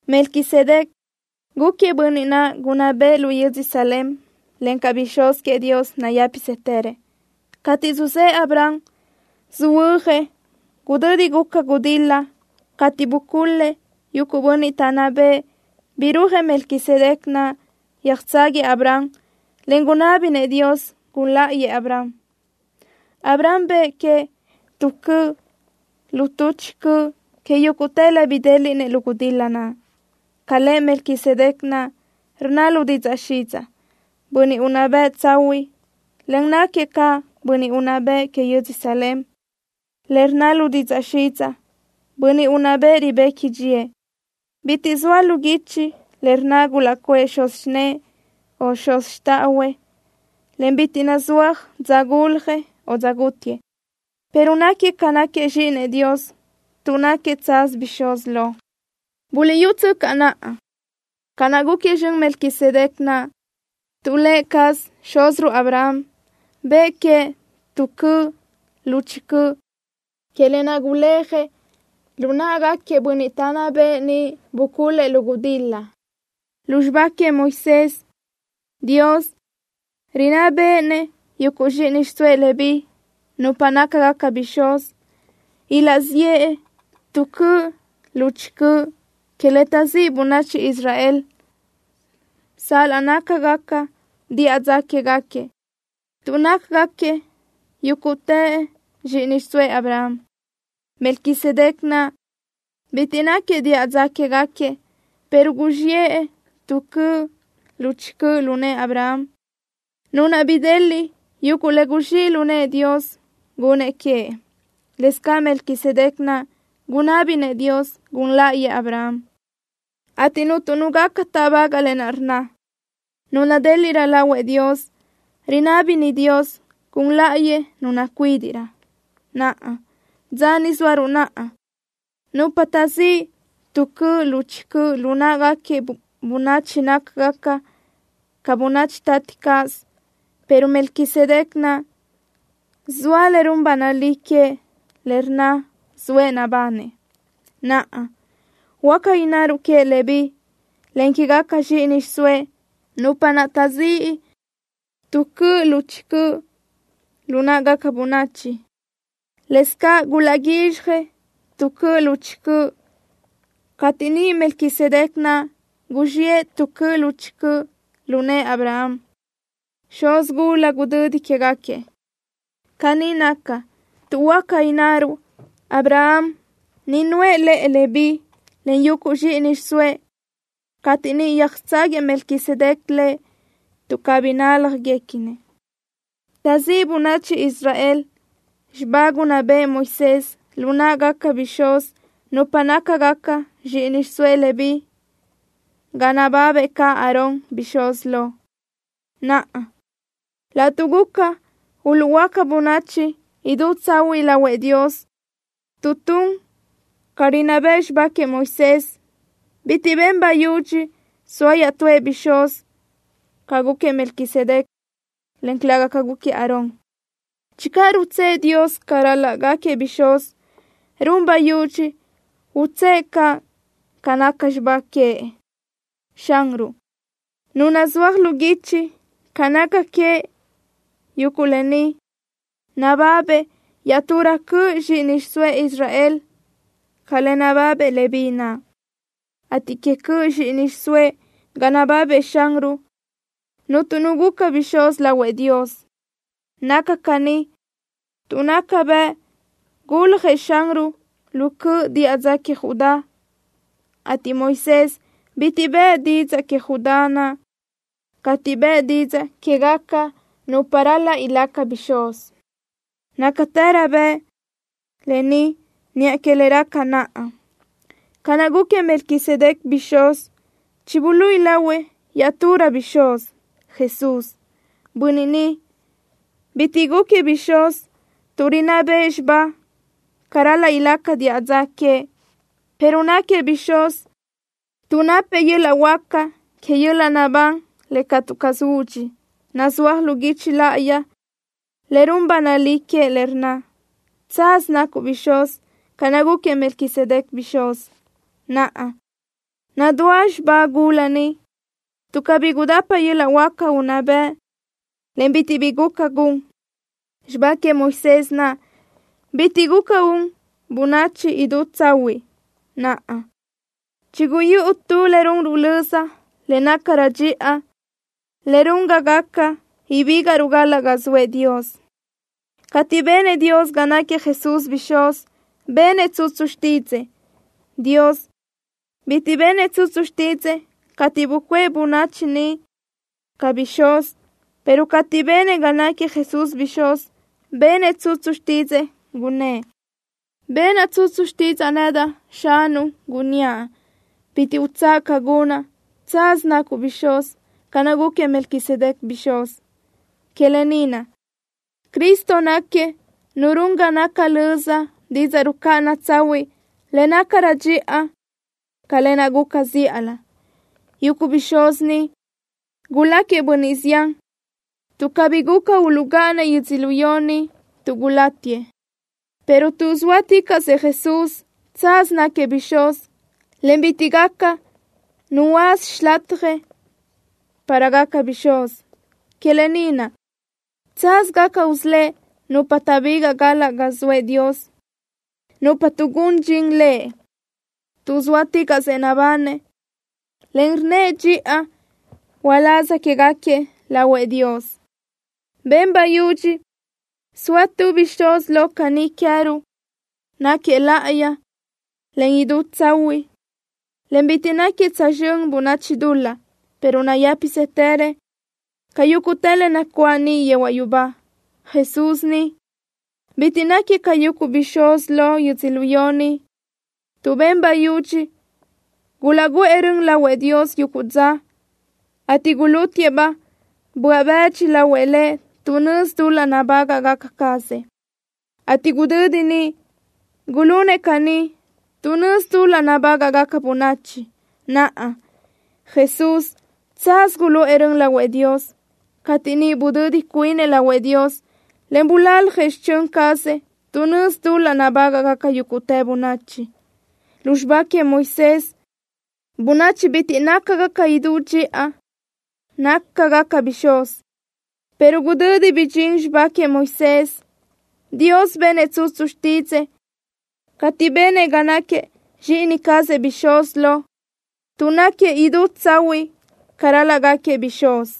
Melquisedec gúquiëʼ bönniʼ naʼ gunná bëʼë lu yödzö Salem, encaʼ bixúz queëʼ Dios, nayë́pisëtërëʼ. Cateʼ suzë́ʼë Abraham, söhuö́jëʼ gudödi guca gudil-la cateʼ bucul-lëʼ yuguʼ bönniʼ taʼnná bëʼë, birúajëʼ Melquisedec naʼ, yöjtságuiëʼ Abraham, en gunábinëʼ Dios gun láʼayëʼ Abraham. Abraham bëʼë queëʼ tu cöʼ tuʼ chi cöʼ que yúguʼtë le bidéliʼnëʼ lu gudil-la naʼ. Ca lëʼ Melquisedec naʼ rnna lu didzaʼ xidzaʼ: “Bönniʼ Unná Bëʼ Tsahuiʼ”, en náquiëʼ caʼ Bönniʼ unná bëʼ que yödzö Salem, le rnna lu didzaʼ xidzaʼ: “Bönniʼ Unná Bëʼ Ribequi Dxíëʼ.” Bitiʼ zoa lu guichi le rnna gulaʼcuʼë xuz xinë́ʼë, o xuz xtáʼahuëʼ, en bitiʼ nazúaj dza guljëʼ o dza gútiëʼ, pero náquiëʼ ca náquiëʼ Zxíʼinëʼ Dios tuʼ náquiëʼ tsaz bixúz lo. Buliʼyútsöcaʼ naʼa, ca naʼ gúquiëʼ zxön Melquisedec naʼ, tuʼ lë cazëʼ xúziruʼ Abraham bëʼë queëʼ tu cöʼ tuʼ chi cöʼ que lë naʼ guléajëʼ lu náʼagaquiëʼ bönniʼ taʼnná bëʼë niʼ bucul-lëʼ lu gudil-la. Lu xibá queëʼ Moisés, Dios rinná béʼenëʼ yuguʼ zxíʼini xiʼsóëʼ Leví, nupa nácagaca bixúz, ilaʼziʼë tu cöʼ tuʼ chi cöʼ que le taʼzíʼ bönachi Israel, sal-laʼ nácagaca diʼa dza quégaquiëʼ, tuʼ nácagaquiëʼ yúguʼtëʼ zxíʼini xiʼsóëʼ Abraham. Melquisedec naʼ bitiʼ náquiëʼ diʼa dza quégaquiëʼ, pero guzxiʼë tu cöʼ tuʼ chi cöʼ lu nëʼë Abraham, nu naʼ bideliʼ yuguʼ le guzxíʼ lu nëʼë Dios gunnëʼ queëʼ. Lëscaʼ Melquisedec naʼ gunábinëʼ Dios gun láʼayëʼ Abraham, ateʼ cuntu nu gaca táʼbagaʼ lë naʼ rnna: Nu nadéliʼrö lahuëʼ Dios rinábini Dios gun láʼayëʼ nu nacuídiʼrö. Naʼa, dza ni zóaruʼ naʼa, nupa taʼzíʼ tu cöʼ tuʼ chi cöʼ lu náʼagaca bönachi nácagaca caʼ bönachi tati caz, pero Melquisedec naʼ, zoa le run ba nalí queëʼ le rnna zoëʼ nabanëʼ. Naʼa, huáca innaruʼ queëʼ Leví, en quégaca zxíʼini xiʼsóëʼ, nupa naʼ taʼzíʼ tu cöʼ tuʼ chi cöʼ lu náʼagaca bönachi, lëscaʼ gulaʼguízxjëʼ tu cöʼ tuʼ chi cöʼ cateʼ niʼ Melquisedec naʼ guzxiʼë tu cöʼ tuʼ chi cöʼ lu nëʼë Abraham, xuz gula gudödi quégaquiëʼ. Caní naca, tuʼ huáca innaruʼ Abraham niʼ nuʼë lëʼë Leví, en yuguʼ zxíʼini xiʼsóëʼ cateʼ niʼ yöjtságuiëʼ Melquisedec lëʼ, tuʼ cabí náljaniguequinëʼ. Taʼzíʼ bönachi Israel xibá gunná bëʼë Moisés lu náʼagaca bixúz, nupa nácagaca zxíʼini xiʼsóëʼ Leví ga nababëʼ caʼ Aarón, bixúz lo. Naʼa, laʼtuʼ guca uluʼhuöáca bönachi idú tsahuiʼ lahuëʼ Dios tuʼ tun ca rinná bëʼ xibá queëʼ Moisés, bitiʼ ben bayudxi soa iaʼtúëʼ bixúz ca gúquiëʼ Melquisedec, en calëga ca gúquiëʼ Aarón. Channö rutsë́ʼë Dios ca ral-laʼ gáquiëʼ bixúz, run bayudxi utsë́ʼë caʼ ca naca xibá queëʼ. Xanruʼ, Nu naʼ nazúaj lu guichi ca naca queëʼ yuguʼ lë ni, nababëʼ iaʼturö cöʼ zxíʼini xiʼsóëʼ Israel ca le nababëʼ Leví naʼ, ateʼ que cöʼ zxíʼini xiʼsóëʼ ga nababëʼ Xanruʼ, cuntu nu guca bixúz lahuëʼ Dios. Naca caní tuʼ naca bëʼ guljëʼ Xanruʼ lu cöʼ diʼa dza queëʼ Judá, ateʼ Moisés bitiʼ bëʼë didzaʼ queëʼ Judá naʼ cateʼ bëʼë didzaʼ quégaca nupa ral-laʼ ilaca bixúz. Nácatërö bëʼ lë ni niʼa que le raca naʼa. Ca naʼ gúquiëʼ Melquisedec bixúz, chibuluíʼi lahuëʼ iaʼturëʼ bixúz, Jesús. Bönniʼ ni, bitiʼ gúquiëʼ bixúz tuʼ rinná bëʼ xibá ca ral-laʼ ilaca diʼa dza queëʼ, pero náquiëʼ bixúz tuʼ napëʼ yöl-laʼ huáca que yöl-laʼ naʼbán le catu caz údxi. Nazúaj lu guichi láʼayi le run ba nalí queëʼ le rnna: Tsaz nacuʼ bixúz ca naʼ gúquiëʼ Melquisedec bixúz. Naʼa, nadúa xibá gula niʼ, tuʼ cabí gudapa yöl-laʼ huáca unná bëʼ, en bitiʼ bi guca gun. Xibá queëʼ Moisés naʼ bitiʼ guca un bönachi idú tsahuiʼ. Naʼa, chiguyúʼu tu le runruʼ löza le nácarö dxiʼa, le run ga gaca ibígaʼruʼ galaʼ ga zoëʼ Dios. Cateʼ benëʼ Dios ga náquiëʼ Jesús bixúz, benëʼ tsutsu xtídzëʼë. Dios bitiʼ benëʼ tsutsu xtídzëʼë cateʼ bucuʼë bönachi niʼ ca bixúz, pero cateʼ benëʼ ga náquiëʼ Jesús bixúz, benëʼ tsutsu xtídzëʼë, gunnë́ʼ: Benaʼ tsutsu xtídzaʼa nedaʼ, Xanuʼ, gunníaʼ: “Bitiʼ utsáʼa ca gunaʼ. Tsaz nacuʼ bixúz ca naʼ gúquiëʼ Melquisedec bixúz.” Que lë ni naʼ, Cristo náquiëʼ Nu run ga naca löza didzaʼ rucáʼana tsahuiʼ le nácarö dxiʼa ca lë naʼ guca zíʼalö. Yuguʼ bixúz niʼ guláquiëʼ bönniʼ zián, tuʼ cabí guca uluʼgáʼanëʼ yödzölió ni tuʼ gulátiëʼ, pero tuʼ zóaticaʼsëʼ Jesús, tsaz náquiëʼ bixúz, en bitiʼ gaca nu huöáza xilatjëʼ para gaca bixúz. Que lë ni naʼ, tsaz gaca usölë́ʼ nupa taʼbigaʼ galaʼ ga zoëʼ Dios, nupa tuʼgún dxin Lëʼ, tuʼ zóaticaʼsëʼ nabanëʼ, en rnnëʼ dxiʼa uláz quégaquiëʼ lahuëʼ Dios. Ben bayudxi soa tu bixúz lo caní queë́ruʼ. Náquiëʼ láʼayi, en idú tsahuiʼ, en bitiʼ náquiëʼ tsözxö́n bönachi dul-laʼ, pero nayë́pisëtërëʼ ca yúguʼtë le nacuáʼ niʼ yehuaʼ yubá. Jesús ni, bitiʼ náquiëʼ ca yuguʼ bixúz lo yödzölió ni, tuʼ ben bayudxi gulaʼguʼë rön lahuëʼ Dios yuguʼ dza, ateʼ gulútiëʼ-baʼ böaʼ bëdxi lahuëʼ Lëʼ tuʼ nözi dul-laʼ nabágaʼgaca cazëʼ, ateʼ gudödi niʼ gulunëʼ caní tuʼ nözi dul-laʼ nabágaʼgaca bönachi. Naʼa, Jesús, tsaz guluʼë rön lahuëʼ Dios, cateʼ niʼ budödi cuinëʼ lahuëʼ Dios, en bulaljëʼ xichö́n cazëʼ tuʼ nözi dul-laʼ nabágaʼgaca yúguʼtë bönachi. Lu xibá queëʼ Moisés bönachi bitiʼ nácagaca idú dxiʼa nácagaca bixúz, pero gudödi bidxín xibá queëʼ Moisés, Dios benëʼ tsutsu xtídzëʼë, cateʼ benëʼ ga náquiëʼ Zxíʼini cazëʼ bixúz lo, tuʼ náquiëʼ idú tsahuiʼ ca ral-laʼ gáquiëʼ bixúz.